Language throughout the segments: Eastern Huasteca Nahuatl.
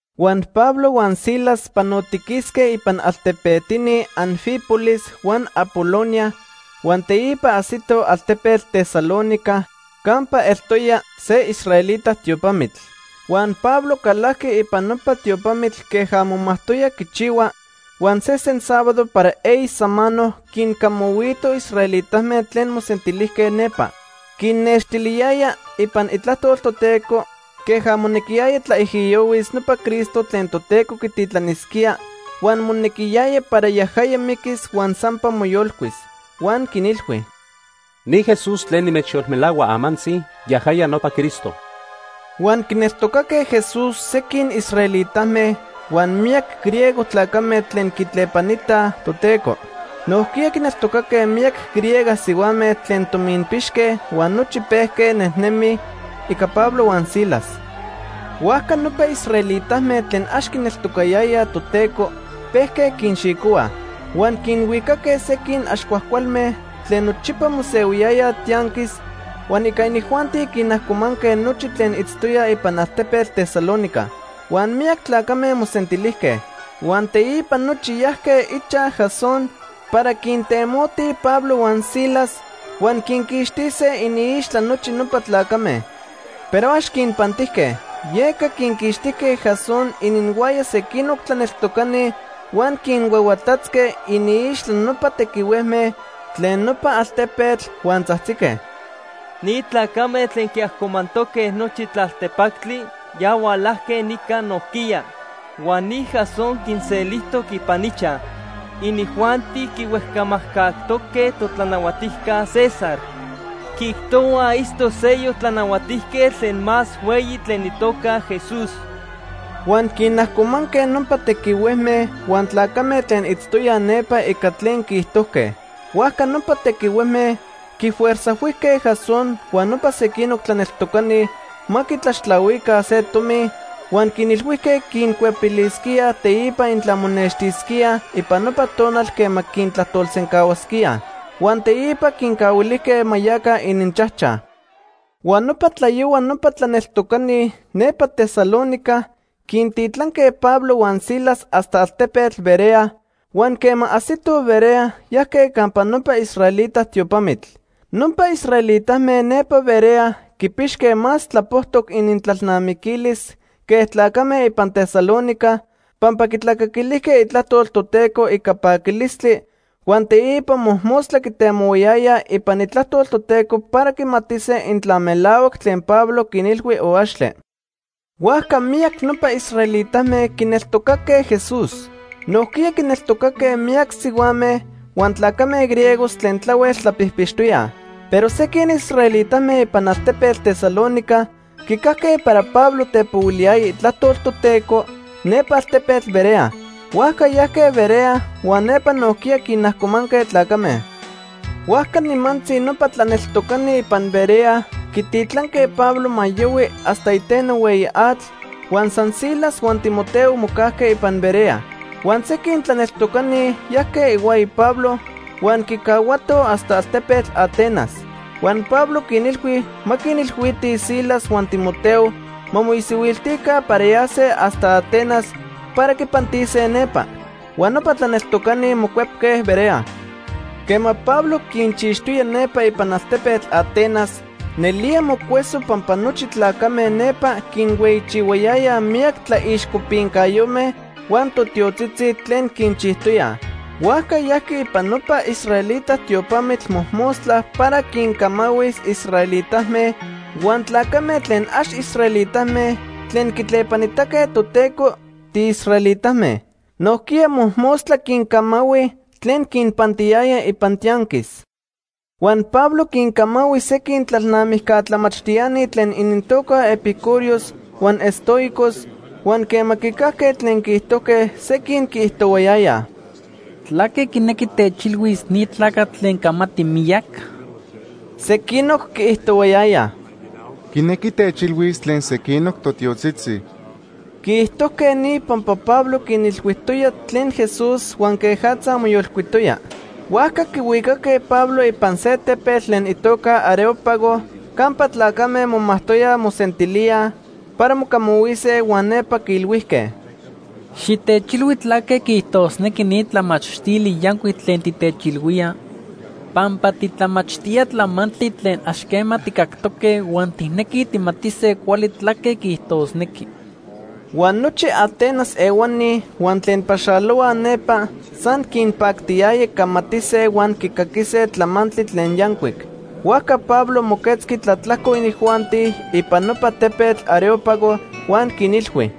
Huan Pablo huan Silas panotiquisque ipan altepetini Anfípolis huan Apolonia huan teipa ajsitoj altepetl Tesalónica campa eltoya se israelita tiopamitl. Huan Pablo calajqui ipan nopa tiopamitl queja momajtoya quichihua, huan sesen sábado para eyi samano quincamahuito israelitame tlen mosentilijque nepa. Quinnextiliyaya ipan Itlajtol Toteco queja monequiyaya tlaijiyohuis nopa Cristo tlen Toteco quititlanisquía huan monequiyaya para yajaya miquis huan sampa moyolcuis. Huan quinilhui: ―Ni Jesús tlen nimechyolmelahua amantzi, yajaya nopa Cristo. Huan quineltocaque Jesús sequin israelitame huan miyac griego tlacame tlen quitlepanitaj Toteco. Nojquiya quineltocaque miyac griega sihuame tlen tominpixque huan nochi pejque nejnemij ica Pablo huan Silas. Huajca nopa israelitame tlen ax quineltocatoyaj Toteco pejque quinxicohuaj. Huan quinhuicaque sequin ax cuajcualme tlen nochipa mosehuiyayaj tianquis, huan ica inijuanti quinajcomanque nochi tlen itztoyaj ipan altepetl Tesalónica. Huan miyac tlacame mosentilijque. Huan teipa nochi yajque ichaj Jasón para quintemotij Pablo huan Silas huan quinquixtise iniixtla nochi nopa tlacame. Pero ax quinpantijque. Yeca quinquixtijque Jasón ininhuaya sequinoc tlaneltocani, huan quinhuahuatatzque iniixtla nopa tequihuejme tlen nopa altepetl huan tzajtzique: ―Ni tlacame tlen quiajcomantoque nochi tlaltepactli ya hualajque nica nojquiya. Huan ni Jasón quinselijtoc ipan ichaj. Inijuanti quihuejcamajcajtoque totlanahuatijca César. Quiijtohuaj itztoc seyoc tlanahuatijquetl tlen más hueyi tlen itoca Jesús. Huan quinajcomanque nopa tequihuejme huan tlacame tlen itztoyaj nepa ica tlen quiijtojque. Huajca nopa tequihuejme quifuerzajhuijque Jasón huan nopa sequinoc tlaneltocani ma quitlaxtlahuica se tomi huan quinilhuijque quincuepilisquíaj teipa intla monextisquíaj ipan nopa tonal quema quintlajtolsencahuasquíaj. Huan teipa quincahuilijque ma yaca ininchajchaj. Huan nopa tlayohua nopa tlaneltocani nepa Tesalónica quintitlanque Pablo huan Silas hasta altepetl Berea, huan quema ajsitoj Berea, yajque campa nopa israelita tiopamitl. Nopa israelitame nepa Berea quipixque más tlapojtoc inintlalnamiquilis que tlacame ipan Tesalónica, pampa quitlacaquilijque itlajtol Toteco ica paquilistli huan teipa mojmostla quitemohuayayaj ipan Itlajtol Toteco para quimatise intla melahuac tlen Pablo quinilhui o axtle. Huajca miyac nopa israelitame quineltocaque Jesús. Nojquiya quineltocaque miyac sihuame huan tlacame griegos tlen tlahuel tlapijpixtoyaj. Pero sequin israelitame ipan altepetl Tesalónica quicajque para Pablo tepohuiliyaya itlajtol Toteco nepa altepetl Berea. Huajca yajque Berea huan nepa nojquiya quinajcomanque tlacame. Huajca nimantzi nopa tlaneltocani ipan Berea quititlanque Pablo ma yohui hasta iteno hueyi atl, huan san Silas huan Timoteo mocajque ipan Berea. Huan sequin tlaneltocani yajque ihuaya Pablo huan quicahuatoj hasta altepetl Atenas. Huan Pablo quinilhui ma quinilhuitij Silas huan Timoteo ma moisihuiltica para yase hasta Atenas para quipantise nepa. Huan nopa tlaneltocani mocuepque Berea. Quema Pablo quinchixtoya nepa ipan altepetl Atenas, nelía mocueso pampa nochi tlacame nepa quinhueyichihuayayaj miyac tlaixcopincayome huan totiotzitzi tlen quinchijtoyaj. Huajca yajqui ipan nopa israelita tiopamitl mojmostla para quincamahuis israelitame huan tlacame tlen ax israelitame tlen quitlepanitaque Toteco tiisraelitame. Nojquiya mojmostla quincamahui tlen quinpantiyaya ipan tianquis. Huan Pablo quincamahui sequin tlalnamijca tlamachtiani tlen inintoca epicúreos huan estoicos, huan quema quicajque tlen quiijtojque, sequin quiijtohuayayaj: ―¿Tlaque quinequi techilhuis ni tlacatl tlen camati miyac? Sequinoc quiijtohuayayaj: ―Quinequi techilhuis tlen sequinoc totiotzitzi. Quiijtojque ni pampa Pablo quinilhuijtoya tlen Jesús huan quejatza moyolcuitoya. Huajca quihuicaque Pablo ipan se tepetl tlen itoca Areópago campa tlacame momajtoyaj mosentilíaj para mocamahuise huan nepa quiilhuijque: ―Xitechilhui tlaque quiijtosnequi ni tlamachtili yancuic tlen titechilhuía, pampa titlamachtía tlamantli tlen ax quema tijcactoque huan tijnequij tijmatise cuali tlaque quiijtosnequi. Huan nochi Atenas ehuani huan tlen paxalohuaj nepa san quinpactiyaya camatise huan quicaquise tlamantli tlen yancuic. Huajca Pablo moquetzqui tlatlajco inijuanti ipan nopa tepetl Areópago huan quinilhui: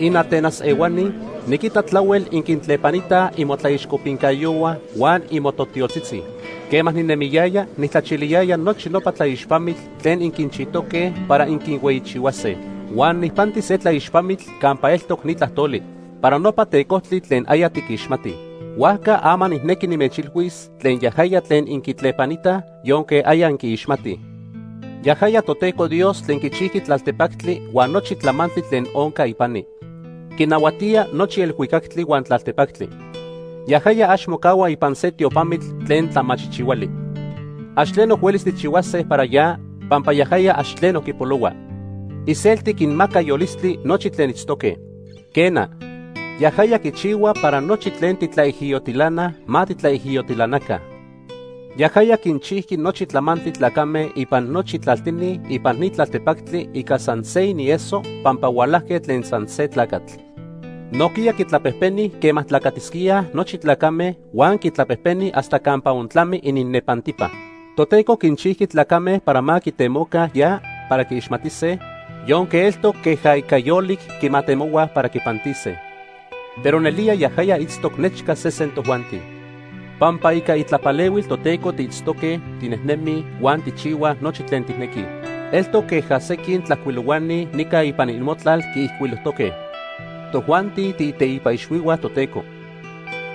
“InAtenas ehuani, niquita tlahuel inquintlepanitaj imotlaixcopincayohua huan imototiotzitzi. Quema ninemiyaya, nijtlachiliyaya nochi nopa tlaixpamitl tlen inquinchijtoque para inquinhueyichihuase. Huan nijpanti se tlaixpamitl campa eltoc ni tlajtoli: ‘Para nopa tecojtli tlen aya tiquixmatij.’ Huajca ama nijnequi nimechilhuis tlen yajaya tlen inquitlepanitaj yonque aya inquiixmatij. “Yajaya Toteco Dios tlen quichijqui tlaltepactli huan nochi tlamantli tlen onca ipani. Quinahuatía nochi elhuicactli huan tlaltepactli. Yajaya ax mocahua ipan se tiopamitl tlen tlamachijchihuali. Ax tleno huelis tijchihuase para ya, pampa yajaya ax tleno quipolohua. Iselti quinmaca yolistli nochi tlen itztoque. Quena, yajaya quichihua para nochi tlen titlaijiyotilanaj ma titlaijiyotilanaca. “Yajaya quinchijqui nochi tlamantli tlacame ipan nochi tlaltini ipan ni tlaltepactli ica san se inieso pampa hualajque tlen san se tlacatl. Nojquiya quitlapejpeni quema tlacatisquíaj nochi tlacame huan quitlapejpeni hasta campa ontlami ininnepantipa. Toteco quinchijqui tlacame para ma quitemoca ya para quiixmatise, yonque eltoc queja ica yolic quimatemohuaj para quipantise. Pero nelía yajaya itztoc nechca sesen tojuanti. Pampa ica itlapalehuil Toteco tiitztoque, tinejnemij huan tijchihuaj nochi tlen tijnequij. Eltoc queja sequin tlajcuilohuani nica ipan imotlal quiijcuilojtoque: ‘Tojuanti tiiteipa ixhuihua Toteco.’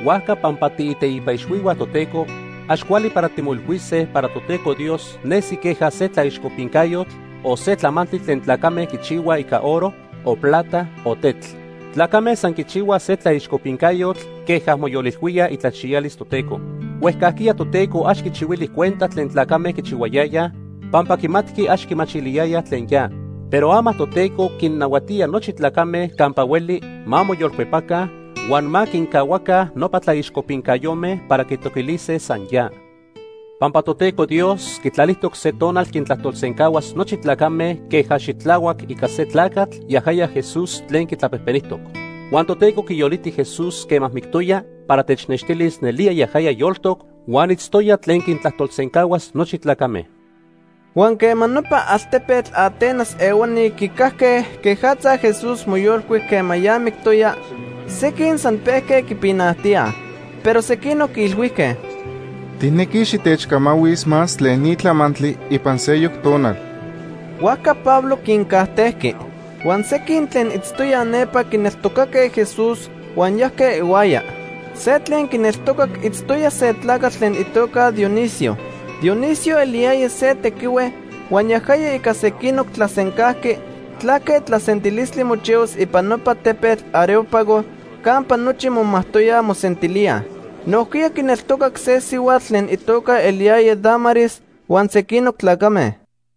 Huajca pampa tiiteipa ixhuihua Toteco, ax cuali para timoilhuise para Toteco Dios nesi queja se tlaixcopincayotl o se tlamantli tlen tlacame quichihuaj ica oro, o plata o tetl. Tlacame san quichihuaj se tlaixcopincayotl queja moyolilhuíaj itlachiyalis Toteco. Huejcajquiya Toteco ax quichihuili cuenta tlen tlacame quichihuayayaj pampa quimatqui ax quimachiliyayaj tlen ya. Pero ama Toteco quinnahuatía nochi tlacame campa hueli ma moyolcuepaca huan ma quincahuaca nopa tlaixcopincayome para quitoquilise san ya. Pampa Toteco Dios quitlalijtoc se tonal quintlajtolsencahuas nochi tlacame queja xitlahuac ica se tlacatl, yajaya Jesús tlen quitlapejpenijtoc. Huan Toteco quiyoliti Jesús quema mictoya para technextilis nelía yajaya yoltoc huan itztoya tlen quintlajtolsencahuas nochi tlacame.” Huan quema nopa altepetl Atenas ehuani quicajque quejatza Jesús moyolcuic quema ya mictoya, sequin san pejque quipinajtíaj, pero sequinoc quiilhuijque: ―Tijnequij xitechcamahuis más tlen ni tlamantli ipan seyoc tonal. Huajca Pablo quincajtejqui. Huan sequin tlen itztoyaj nepa quineltocaque Jesús, huan yajque ihuaya. Se tlen quineltocac itztoya se tlacatl tlen itoca Dionisio. Dionisio eliyaya se tequihue huan yajaya ica sequinoc tlasencajqui tlaque tlasentilistli mochihuas ipan nopa tepetl Areópago campa nochi momajtoyaj mosentilíaj. Nojquiya quineltocac se sihuatl tlen itoca eliyaya Dámaris huan sequinoc tlacame.